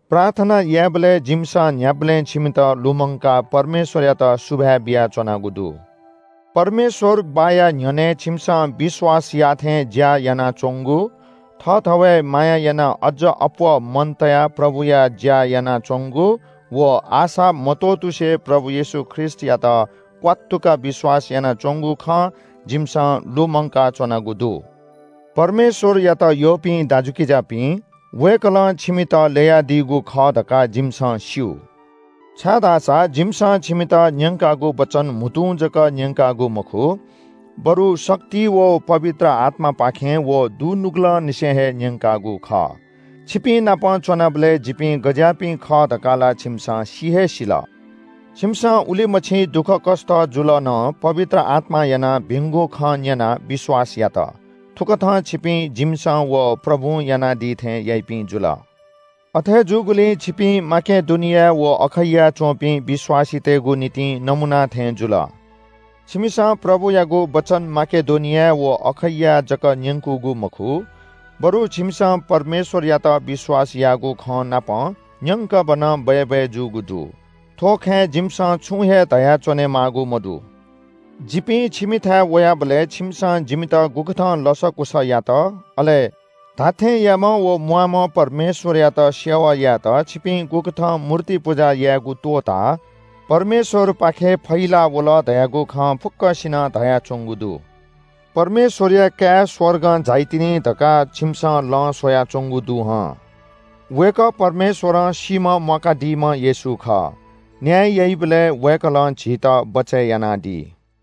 प्रार्थना यायेबलय् जिमिसं न्‍ह्याबलें छिमित लुमंकाः परमेश्‍वरयात सुभाय् बियाच्‍वनागु दु। परमेश्‍वर बाःया न्‍ह्यःने छिमिसं विश्‍वास याःथें ज्‍या यानाच्‍वंगु, थःथवय् माया यानाः अज्‍ज अप्‍वः मन तयाः प्रभुया ज्‍या यानाच्‍वंगु व आशा मत्‍वःतुसे प्रभु येशू ख्रीष्‍टयात क्‍वात्तुक विश्‍वास यानाच्‍वंगु खँ जिमिसं लुमंकाच्‍वनागु दु। परमेश्‍वरयात यःपिं दाजुकिजापिं, वय्‌कलं छिमित ल्‍ययादीगु खः धकाः जिमिसं स्‍यू। छाय्‌धाःसा जिमिसं छिमित न्‍यंकागु वचन म्‍हुतुं जक न्‍यंकागु मखु, बरु शक्ति व पवित्र आत्‍मापाखें व दुनुगलंनिसें हे न्‍यंकागु खः। छिपिंनाप च्‍वनाबलय् जिपिं गज्‍याःपिं खः धकाः ला छिमिसं सि हे सिल। छिमिसं उलिमछि दुःखकष्‍ट जुल नं पवित्र आत्‍मां यानाः भिंगु खँ न्‍यनाः विश्‍वास यात। थुकथं छिपिं जिमिसं व प्रभुं यानादी थें याइपिं जुल। अथे जूगुलिं छिपिं माकेडोनिया व अखैयाय् च्‍वंपिं विश्‍वासीतय्‌गु निंतिं नमूना थें जुल। छिमिसं प्रभुयागु वचन माकेडोनियाय् व अखैयाय् जक न्‍यंकूगु मखु, बरु छिमिसं परमेश्‍वरयात विश्‍वास याःगु खँनापं न्‍यंकभनं बय्‌बय् जूगु दु। थ्‍व खँय् जिमिसं छुं हे धया च्‍वनेमाःगु मदु। जिपिं छिमिथाय् वयाबलय् छिमिसं जिमित गुकथं लसकुस यात अले धात्‍थेंयाम्‍ह व म्‍वाःम्‍ह परमेश्‍वरयात सेवा यायेत छिपिं गुकथं मूर्ति पुजा यायेगु त्‍वःताः परमेश्‍वरपाखे फहिला वल धयागु खँ फुक्‍कसिनं धयाच्‍वंगु दु। छिमिसं परमेश्‍वरया काय् स्‍वर्गं झाइतिनि धकाः लँ स्‍वयाच्‍वंगु दु हं। वय्‌कः परमेश्‍वरं सीम्‍हं म्‍वाकादीम्‍ह येशू खः। न्‍याय याइबलय् वय्‌कलं झीत बचय् यानादी।